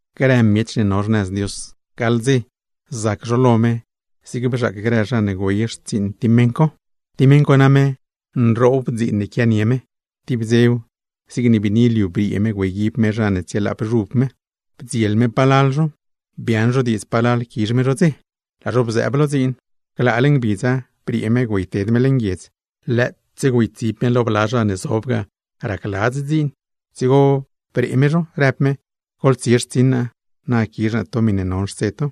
’Grë zha ne no xnëz Dios, zac zho lo me zig bzhaac grë zha ne güey xtsiiṉ tib meṉ co. ’Tib meṉ co name nroob dziin quianie me, tib dzew zigne biini liu briee me güeyguib me zha ne tsielaap xuv me. Bdziel me palal zho, biaaṉ zho diidz palal quizh me zho dze, laa zho bzëëb lo dziin. Glaale ngbidza briee me güeyted me leṉ guiedz, lëëtse güeytsib me lo bla zha ne zob ga racladz dziin. Dzigo bree me zho, rëb me: “Goḻtsie xtsiṉ naa, na quizh naa to miṉe non xtse to.”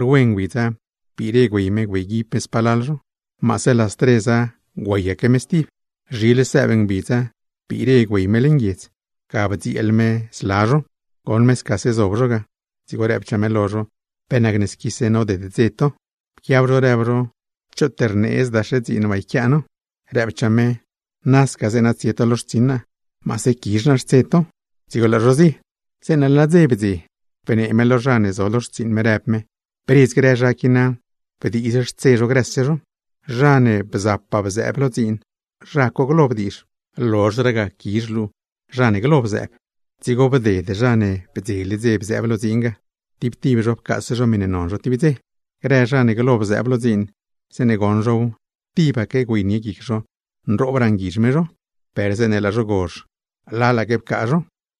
’Rwe ngbidza, biire me güey me güeyguib me spalal zho. Maase las treza güeyaque me stib. ’Zhile sëëb ngbidza, biire me güey me leṉ guiedz. Ga bdzieel me zla zho, goṉ me scase zob zho ga. Dzigo rëbchaa me lo zho: “¿Pe nacne squise noded dze to?” Pquiab zho rëb zho: “Choot rneedzdaxe dziin waa yquiaa no.” Rëbchaa me: “Nasca zeeṉa tsie to lo xtsiṉ naa, maase quizh naa xtse to.” Dzigo laa zho zie. ’Zeeṉe laa dze blozh bdze, bnee me lo zha ne zo lo xtsiiṉ me, rëb me: “Bredz grë zha qui na, bdiizh xtse zho grëse zho. Zha ne bza bzëëb lo dziin, zha co glo bdiizh, lozhraa ga quizh luu zha ne glo bzëëb.” Dzigo bded zha ne bdzele dze bzëëb lo dziin ga, tib tib zho pcaase zho miṉe non zho tib dze. Grë zha ne glo bzëëb lo dziin, zeeṉe goṉ zhow, tibaque güeynie guic zho nroobraa nguizh me zho. Per zeeṉe laa zho gozh, lalgaque pcaa zho.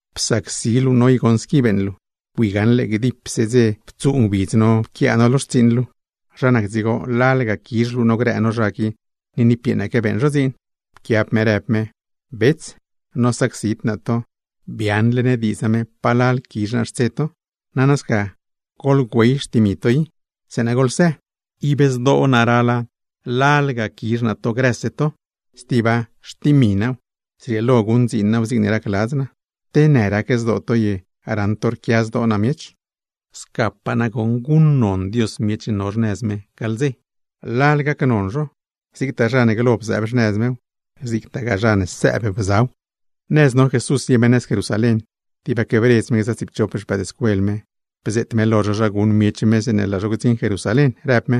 “Psacsi luu no i goṉ squi beeṉ luu. Bui gaṉle gdipse dze ptsuu ngbidz no pquiaa no xtsiiṉ luu, ¿zha nac dzigo lalga quizh luu no grë no zha qui, ni niipyeeṉaque beeṉ zho dziin?” Pquiab me rëb me: “Bets, nosacsid naa to, biaaṉle ne diidz name palal quizh naa xtse to. Nana sca goḻgüey xtimi to i, zeeṉa goḻsë. Ib zdoo naa rala lalga quizh naa to grëse to. ¡Stiba, xtimi naaw, zrieelo guṉdziin naaw zigne racladz naa! ¿Te në rac zdoo to ye, raṉ to rquia zdoo naa miech?” ’Scapaa nagoṉ gac zha ne no xnëz Dios. Lal gacnon zho, zigtaa zha ne glo bzëëb xnëz mew, zigtagaa zha ne sëëb bzaw. Nëz no Jesús zie me nëz Jerusalén, tibaque bredz me gza tsiipchop xpëëdscuel me, bzeet me lo zho zha guṉ miech me zeeṉe laa zho gdziṉ Jerusalén, rëb me: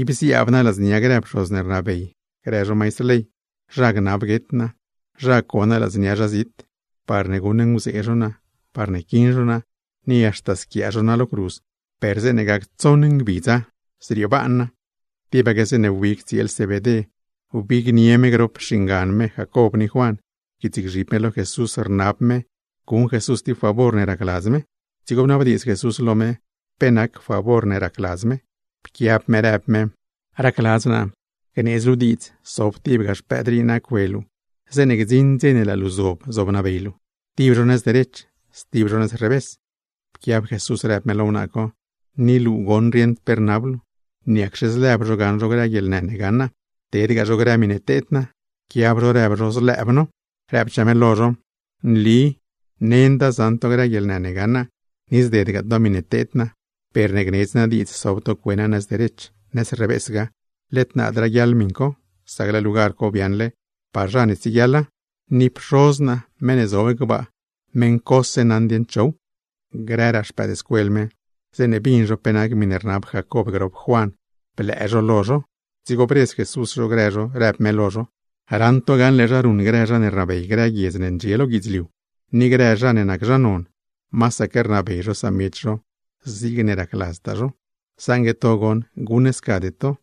―Ib ziaab naa ladznia grë pxoz ne rnabey grë zho maistr ley, zha gnab guet naa. Zha co naa ladznia zha zit, parne guṉnguzee zha co naa, parne quiṉ zho naa, ni haxta squiaa zho naa lo cruz. Per zeeṉe gac tsoṉ ngbidza, zriebaan naa. Tibaque zeeṉe wbig tsieel Zebedé wbignie me grop xingan me Jacob ni Juan, pquiitsgzhib me lo Jesús rnab me guṉ Jesús tib favor ne racladz me. Dzigo bnabdiidz Jesús lo me, pe nac favor ne racladz me. Pquiab me rëb me: ―Racladz naa gneedz luu diidz sob tibga xpëëd rii naa cue luu zeeṉe gdziṉ dze ne laa luu zob zobnabey luu; tib zho nëz derech, stib zho nëz revés. Pquiab Jesús rëb me lo wnaa co: ―¡Ni luu goṉ rieṉd pe rnab luu! ¿Niacxe zlëb zho gaṉ zho grë guieḻnë ne gaṉ naa, tedgaa zho grë miṉe teed naa? Pquiab zho rëb zho: ―Zlëëb no. Rëbchaa me lo zho: ―Nli nenda zaṉ to grë guieḻnë ne gaṉ naa, ni zdedgaa to miṉe teed naa; per ne gnedz naa diidz sob to cue naa nëz derech, nëz revésgaa, led naad raguiaḻ miṉ co; sac laa lugar co biaaṉle par zha ne tsieguiaḻa, ni Pxoz naa meṉ ne zob gbaa meṉ cose naṉ dieṉ chow. Grëraa xpëëdscuel me, zeeṉe bin zho pe nac miṉe rnab Jacob grop Juan, blëë zho lo zho. Dzigo bredz Jesús zho grë zho, rëb me lo zho: ―Raṉ to gaṉle zha ruṉ grë zha ne rnabey grë guiedz ne ndxie lo guidzliu, ni grë zha ne nac zha non, masaque rnabey zho samiech zho zigne racladztaa zho. Saṉgue to goṉ guṉscade to.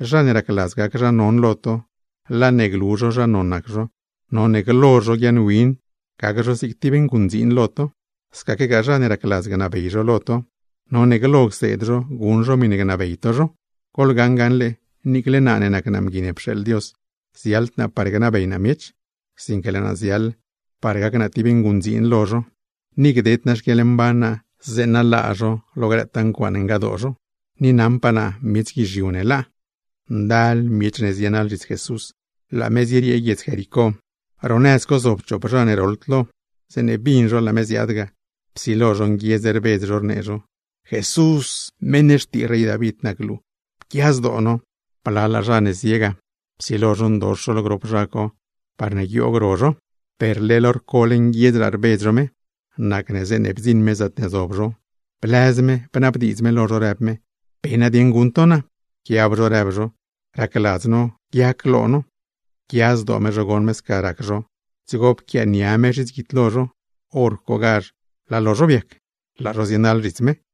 Zha ne racladz gac zho zha non lo to, laa ne glu zho zha non zho, none glo zho guiaaṉwin, gac zho zig tib nguṉdziin lo to. Scaquegaa zha ne racladz gnabey zho lo to, none glo cseed zho guṉ zho miṉe gnabey to zho. Goḻgaṉ gaṉle, niicle naa ne nac naa Mgui ne pxeeḻ Dios, ziaḻd naa par gnabey naa miech, sinque laa naa ziaḻ par gac naa tib nguṉdziin lo zho, ni gded naa xquieḻmban naa zeeṉa laa zho lo grëtaa ncuaaṉe ngadoo zho. Ni naṉpaa naa miech guizhiu ne laa. Miech guizhiu naḻ zhits Jesús, laa me zieriee guiedz Jericó. Ro nëz co zob chop zha ne roḻd lo, zeeṉe bin zho laa me ziaad ga, psilo zho nguiedz rbedz zho rnee zho: ―¡Jesús, meṉ xtii rey David, pquia zdoo no! Blalaa zha ne zie ga, psilo zho ndox zho lo grop zha co parne guioog ro zho, per leḻ hor cole nguiedzraa rbedz zho me. Nacne zeeṉe bdziṉ me zaatne zob zho, blëz me, bnabdiidz me lo zho rëb me: ―¿Pe nadieṉ guṉ to naa? Pquiab zho rëb zho: ―¡Racladz no guiac lo no! Pquia zdoo me zho goṉ me sca rac zho, dzigo pquiaania me zhits guidlo zho. Horcogazh laa lo zho biac, laa zho zienaḻ zhits me.